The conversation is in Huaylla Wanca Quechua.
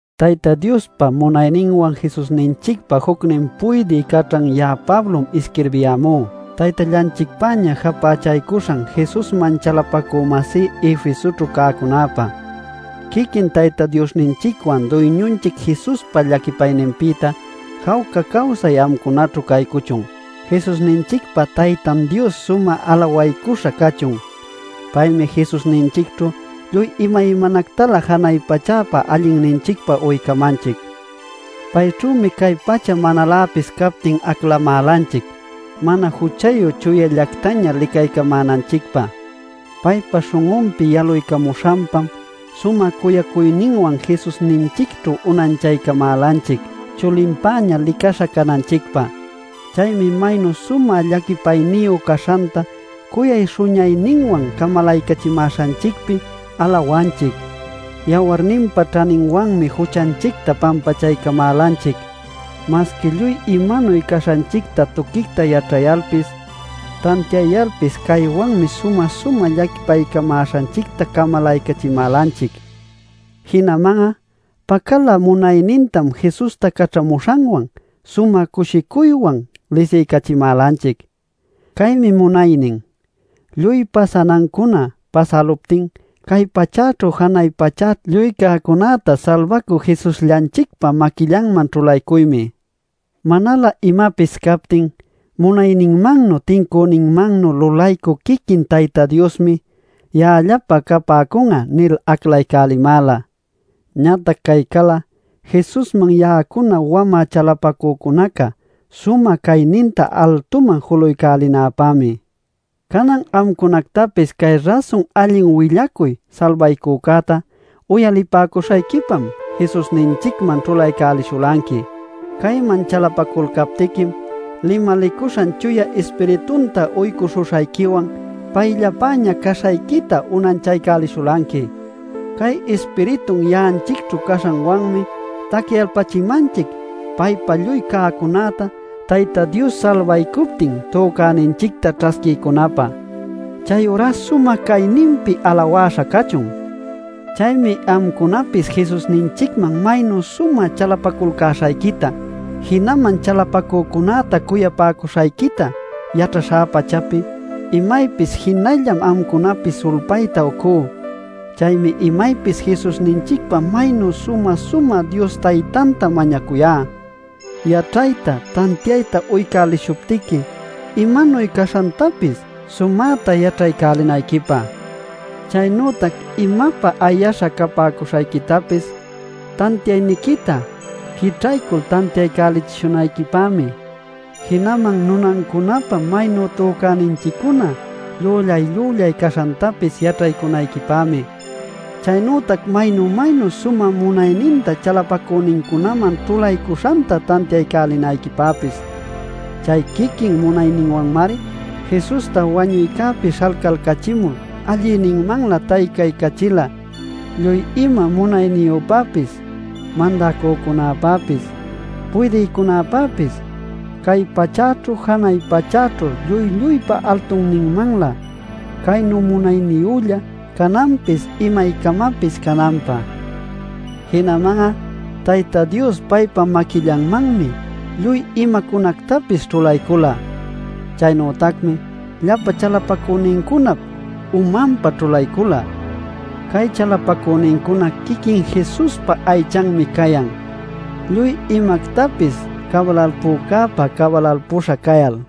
Tayta Diospa munayninwan Jesusninchicpa jucnin puydï caćhan ya'a Pablom isquirbiyämú, Taytallanchicpäña japächaycuśhan Jesusman chalapacü-masí Efesoćhu cäcunäpä. Quiquin Tayta Diosninchicwan Duyñunchic Jesuspa llaquipayninpïta jawca cawsay amcunaćhu caycuchun. ¡Jesusninchicpa Taytan Dios sumä alawaycuśha cachun! Paymi Jesusninchicćhu lluy imaymanactalä janay pachäpä allinninchicpä uycamanchic. Payćhümi cay pacha manaläpis captin aclamälanchic mana juchayu chuyallactaña licaycamänanchicpä. Paypa śhun'unpi yaluycamuśhanpam sumä cuyacuyninwan Jesusninchicćhu unanchaycamälanchic chulinpäña licaśha cananchicpä. Chaymi maynu sumä llaquipayniyu caśhanta cuyay śhuñayninwan camalaycachimäśhanchicpi alawanchic. Yawarninpa ćhaninwanmi juchanchicta pampachaycamälanchic. Masqui lluy imanuy caśhanchicta tuquicta yaćhayalpis, tantiayalpis caywanmi sumä-sumä llaquipaycamäśhanchicta camalaycachimälanchic. Jinaman'a pacalä munaynintam Jesusta caćhamuśhanwan sumä cushicuywan lisiycachimälanchic. Caymi munaynin: Lluy pasanancuna pasäluptin cay pachäćhu janay pachäćhu lluy cäcunäta Salbacü Jesusllanchicpa maquillanman ćhulaycuymi. Manalä imapis captin, munayninmannuy tincüninmannuy lulaycü quiquin Tayta Diosmi: “Ya'allapä capäcun'a” nil aclaycälimäla. Ñatac cay cal'a Jesusman ya'acuna wamä chalapacücunaca sumä cayninta altuman julaycälinäpämi. Canan amcunactapis cay rasun allin willacuy salbaycücäta uyalipäcuśhayquipam Jesusninchicman ćhulaycälishulanqui. Cayman chalapaculcaptiquim limalicuśhan Chuya Ispiritunta uycuśhuśhayquiwan payllapäña caśhayquita unanchaycälishulanqui. Cay Ispiritun ya'anchicćhu caśhancäwanmi tacyalpachimanchic paypa lluy cäcunäta Tayta Dios salbaycuptin tücäninchicta ćhasquiycunapä. ¡Chayurá sumä cayninpi alawäśha cachun! Chaymi amcunapis Jesusninchicman maynu sumä chalapaculcäśhayquita, jinaman chalapacücunäta cuyapäcuśhayquita yaćhaśhá pachapi, imaypis jinallam amcunapi sulpayta ucú. Chaymi imaypis Jesusninchicpa maynu sumä-sumä Dios Taytanta mañacuyá; yaćhayta tantiayta uycälishuptiqui imanuy caśhantapis sumäta yaćhaycälinayquipä. Chaynütac imapä ayaśha capäcuśhayquitapis tantiayniquita quićhaycul tantiaycälichishunayquipämi; jinaman nunancunapä maynu tücäninchiccuna llüllay-llüllay caśhantapis yaćhaycunayquipämi; chaynütac maynu maynu sumä munayninta chalapacünincunaman ćhulaycuśhanta tantiaycälinayquipäpis. Chay quiquin munayninwanmari Jesusta wañuycäpi śhalcalcachimul allïninmanlä taycaycachila lluy ima munayniyüpäpis mandacücunapäpis, puydïcunapäpis, cay pachäćhu janay pachäćhu lluy lluypa altunninmanlä caynu munayniyülla cananpis imaycamapis cananpä. Jinaman'a Tayta Dios paypa maquillanmanmi lluy imacunactapis ćhulaycula. Chaynütacmi llapa chalapacünincunap umanpä ćhulaycula. Cay chalapacünincuna quiquin Jesuspa aychanmi cayan, lluy imactapis cabalalpücäpa cabalalpüśha cayal.